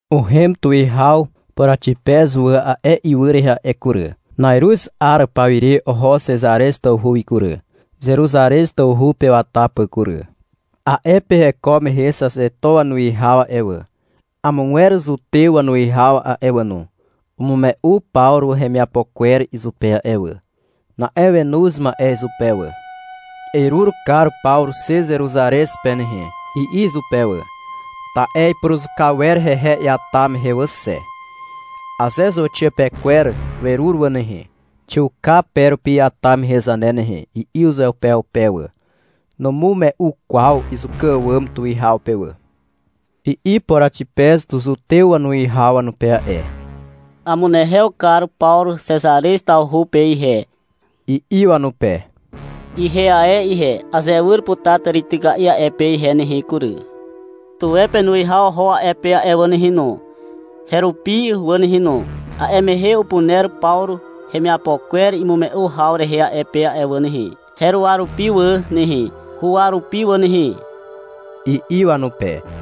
Uhem Tuwihaw Poraxipez wà a'e ywy rehe a'e kury. Na'iruz 'ar pawire oho Xezarez tawhu wi kury, Zeruzarez tawhu pe wata pà kury. A'e pe heko mehe Xaxeto wanuwihaw a'e wà, amogwer zutew wanuwihaw a'e wà no, umume'u Pawru hemiapo kwer izupe a'e wà. Na'e wenoz ma'e izupe wà. — Erur kar Pawru xe Zeruzarez pe nehe, i'i izupe wà. Ta'e ipuruzuka wer hehe iata mehe wà xe. — Aze zauxiapekwer werur wà nehe, xiuka pe rupi iata mehe zane nehe, i'i uzeupeupe wà. (Numume'u kwaw izuka àwàm tuwihaw pe wà.) I'i Poraxipez zutew wanuwihaw wanupe a'e. — Amunehew kar Pawru Xezarez tawhu pe ihe, i'i wanupe. — Ihe ae ihe, azewyr putar tàrityka'i a'e pe ihe nehe kury. Tuwe penuwihaw oho a'e pe a'e wà nehe no, herupi wà nehe no. A'e mehe upuner Pawru hemiapo kwer imume'u haw rehe a'e pe wà nehe, heruwa rupi wà nehe, huwa rupi wà nehe, i'i wanupe.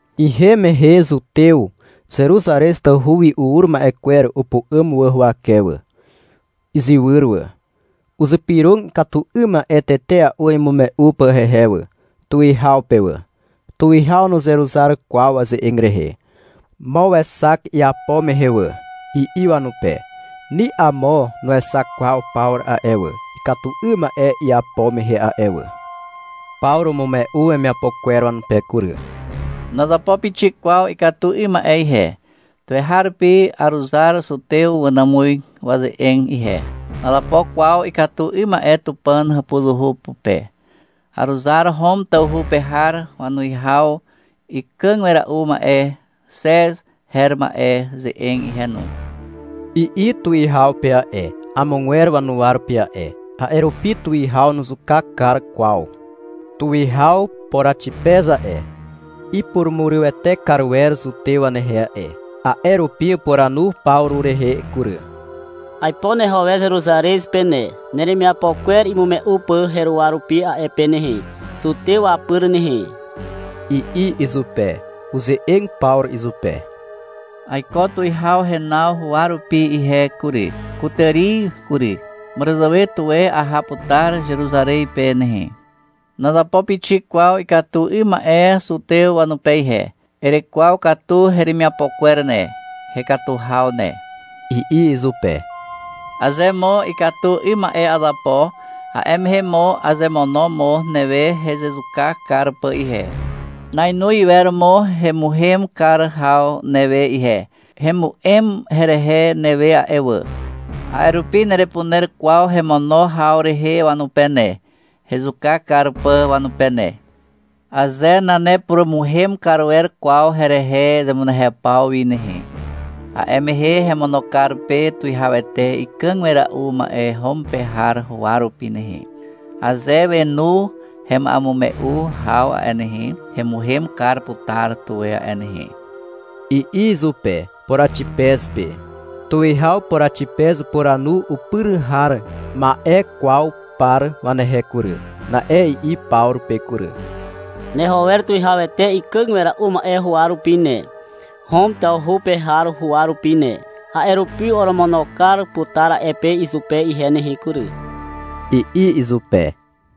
Ihem mehe zutew Zeruzarez tawhu wi ur ma'e kwer upu'àm wà huwake wà, izywyr wà. Uzypyrog ikatu 'ym ma'e tetea'u imume'u pà hehe wà, tuwihaw pe wà. Tuwihaw nuzeruzar kwaw waze'eg rehe. -Mo wexak iapo mehe wà, i'i wanupe. Ni amo nuexak kwaw Pawru a'e wà, ikatu 'ym ma'e iapo mehe a'e wà. Pawru umume'u wemiapo kwer wanupe kury. — Nazapo pixik kwaw ikatu 'ym ma'e ihe. Tuweharupi aruzar zutew wanàmuz waze'eg ihe. Nazapo kwaw ikatu 'ym ma'e Tupàn hàpuzuhu pupe. Aruzar Hom tawhu pe har wanuwihaw ikàg wera'u ma'e Xez her ma'e ze'eg ihe no, i'i tuwihaw pe a'e, amogwer wanuwa rupi a'e. (A'e rupi tuwihaw nuzuka kar kwaw.) Tuwihaw Poraxipez a'e, ipurumurywete kar wer zutew wanehe a'e, a'e rupi upuranu Pawru rehe kury. — Aipo neho wer Zeruzarez pe ne, neremiapo kwer imume'u pà heruwa rupi a'e pe nehe, zutew wapyr nehe, i'i izupe. Uze'eg Pawru izupe. — Aiko tuwihaw renaw huwa rupi ihe kury, kutàri kury. Màràzàwe tuwe aha putar Zeruzarez pe nehe. Nazapo pixik kwaw ikatu 'ym ma'e zutew wanupe ihe. Erekwaw katu heremiapo kwer ne, hekatu haw ne, i'i izupe. Aze mo ikatu 'ym ma'e azapo, a'e mehe mo azemono mo newe hezezuka kar pà ihe. Nainoz iwer mo hemuhem kar haw newe ihe. Hemu'em herehe newe a'e wà. A'e rupi nerepuner kwaw hemono haw rehe wanupe ne, hezuka kar pà wanupe ne. Aze nanepurumuhem kar wer kwaw herehe zemunehew paw wi nehe, a'e mehe hemono kar pe tuwihawete ikàg wera'u ma'e Hom pe har huwa rupi nehe. Aze wenu hema'emume'u haw a'e nehe, hemuhem kar putar tuwe a'e nehe, i'i izupe, Poraxipez pe. Tuwihaw Poraxipez upuranu upyr har ma'ekwaw par wanehe kury. Na'e i'i Pawru pe kury. — Neho wer tuwihawete ikàg wera'u ma'e huwa rupi ne, Hom tawhu pe har huwa rupi ne. A'e rupi oromono kar putar a'e pe izupe ihe nehe kury, i'i izupe.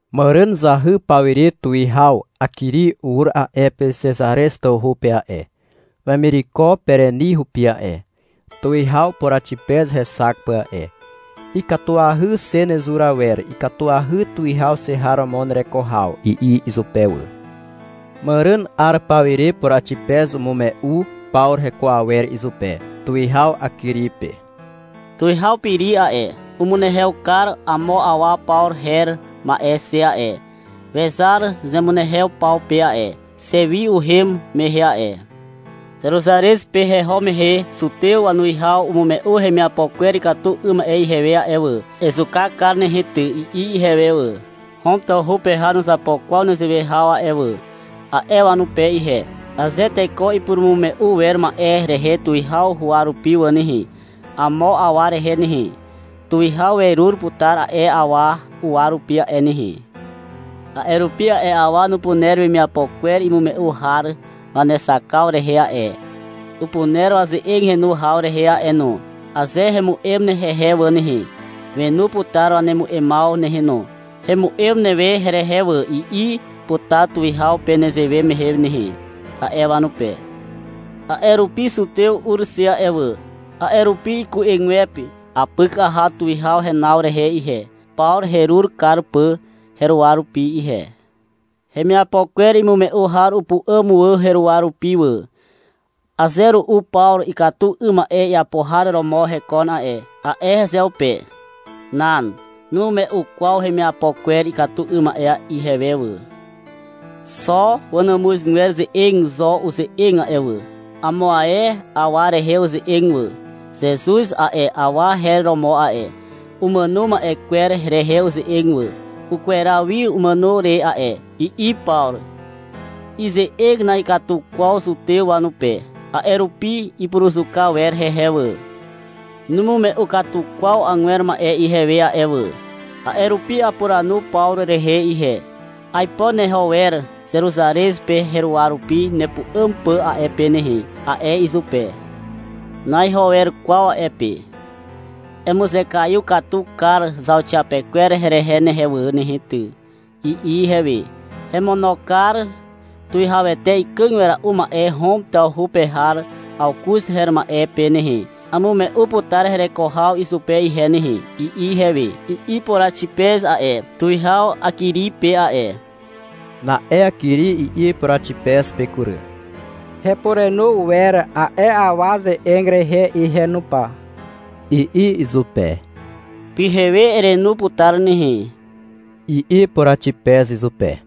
Màràn zahy pawire tuwihaw Akiri ur a'e pe Xezarez tawhu pe a'e, wemireko Pereni hupi a'e, tuwihaw Poraxipez hexak pà a'e. — Ikatuahy xe nezur awer, ikatuahy tuwihaw xe har romo nereko haw, i'i izupe wà. Màràn 'ar pawire Poraxipez umume'u Pawru heko awer izupe, tuwihaw Akiri pe. — Tuwihaw Peri a'e, umunehew kar amo awa Pawru her ma'e xe a'e. Wezar zemunehew paw pe a'e, xe wi uhem mehe a'e. Zeruzarez pe heho mehe zutew wanuwihaw umume'u hemiapo kwer ikatu 'ym ma'e ihewe a'e wà. — Ezuka kar nehe ty, i'i ihewe wà. — Hom tawhu pe har nuzapo kwaw nezewe haw a'e wà, a'e wanupe ihe. — Aze teko ipurumume'u wer ma'e rehe tuwihaw huwa rupi wà nehe, amo awa rehe nehe, tuwihaw werur putar a'e awa uwa rupi a'e nehe. A'e rupi a'e awa upuner wemiapo kwer imume'u har wanexakaw rehe a'e. Upuner waze'eg henu haw rehe a'e no. Aze hemu'em hehe wà nehe, wenu putar wanemu'emaw nehe no. — Hemu'em newe herehe wà, i'i putar tuwihaw pe nezewe mehe nehe, a'e wanupe. A'e rupi zutew ur xe a'e wà. A'e rupi iku'egwepe apyk aha tuwihaw renaw rehe ihe, Pawru herur kar pà heruwa rupi ihe. Hemiapo kwer imume'u har upu'àm wà heruwa rupi wà. — Aze ru'u Pawru ikatu 'ym ma'e iapo har romo hekon a'e, a'e hezeupe. Nan. Numume'u kwaw hemiapo kwer ikatu 'ym ma'e ihewe wà. Xo wàmuzgwer ze'eg rehe zo uze'eg a'e wà. Amo ae awa rehe uze'eg wà. Zezuz a'e awa her romo a'e. Umàno ma'e kwer rehe uze'eg wà. — Ukweraw wi umàno re a'e, i'i Pawru. (Ize'eg na'ikatu kwaw zutew wanupe. A'e rupi ipuruzuka wer hehe wà.) Numume'u katu kwaw agwer ma'e ihewe a'e wà. A'e rupi apuranu Pawru rehe ihe. — Aipo neho wer Zeruzarez pe heruwa rupi nepu'àm pà a'e pe nehe, a'e izupe. Na'iho wer kwaw a'e pe. — Emuzekaiw katu kar zauxiapekwer herehe ne wà nehe ty, i'i ihewe. — Hemono kar tuwihawete ikàg wera'u ma'e Hom tawhu pe har Awkuz her ma'e pe nehe. Amume'u putar hereko haw izupe ihe nehe, i'i ihewe, i'i Poraxipez a'e, tuwihaw Akiri pe a'e. Na'e Akiri i'i Poraxipez pe kury. — Hepurenu wer a'e awa ze'eg rehe ihe no pa, i'i izupe. — Pyhewe erenu putar nehe, i'i Poraxipez izupe.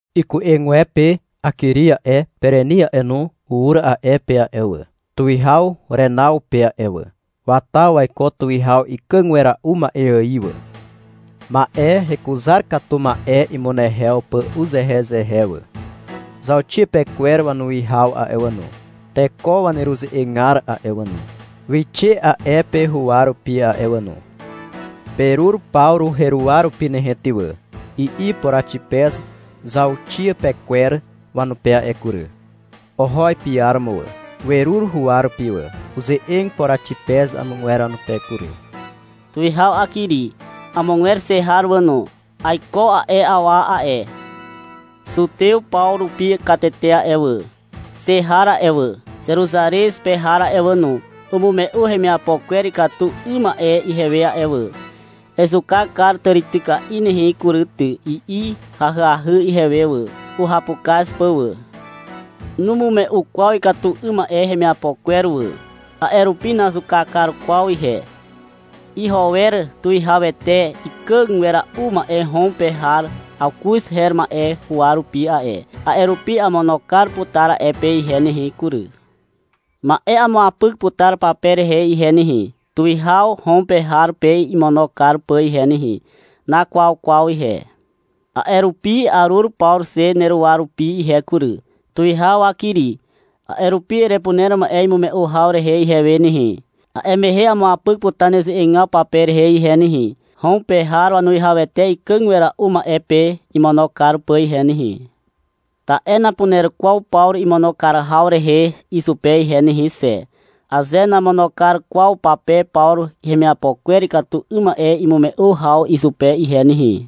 Iku'egwepe Akiri a'e, Pereni a'e no, ur a'e pe a'e wà, tuwihaw renaw pe a'e wà. Wata waiko tuwihaw ikàg wera'u ma'e ài wà, ma'e hekuzar katu ma'e imunehew pà uzehezehe wà. Zauxiapekwer wanuwihaw a'e wà no, teko waneruze'egar a'e wà no, wixe a'e pe huwa rupi a'e wà no. — Perur Pawru heruwa rupi nehe ty wà, i'i Poraxipez zauxiapekwer wanupe a'e kury. Oho ipiaromo wà. Werur huwa rupi wà. Uze'eg Poraxipez amogwer wanupe kury. — Tuwihaw Akiri. Amogwer xe har wà no. Aiko a'e awa a'e. Zutew paw rupi katete a'e wà, xe har a'e wà, Zeruzarez pe har a'e wà no, umume'u hemiapo kwer ikatu 'ym ma'e ihewe a'e wà. — Ezuka kar tàrityka'i nehe kury ty, i'i ahyahy ihewe wà, uhapukaz pà wà. Numume'u kwaw ikatu 'ym ma'e hemiapo kwer wà. A'e rupi nazuka kar kwaw ihe. Iho wer tuwihawete ikàg wera'u ma'e Hom pe har Awkuz her ma'e huwa rupi a'e. A'e rupi amono kar putar a'e pe ihe nehe kury. Ma'e amuapyk putar pape rehe ihe nehe, tuwihaw Hom pe har pe imono kar pà ihe nehe. Nakwaw kwaw ihe. A'e rupi arur Pawru xe neruwa rupi ihe kury, tuwihaw Akiri. A'e rupi erepuner ma'e imume'u haw rehe ihewe nehe. A'e mehe amuapyk putar neze'egaw pape rehe ihe nehe, Hom pe har wanuwihawete ikàg wera'u ma'e pe imono kar pà ihe nehe. Ta'e napuner kwaw Pawru imono kar haw rehe izupe ihe nehe xe, aze namono kar kwaw pape Pawru hemiapo kwer ikatu 'ym ma'e imume'u haw izupe ihe nehe.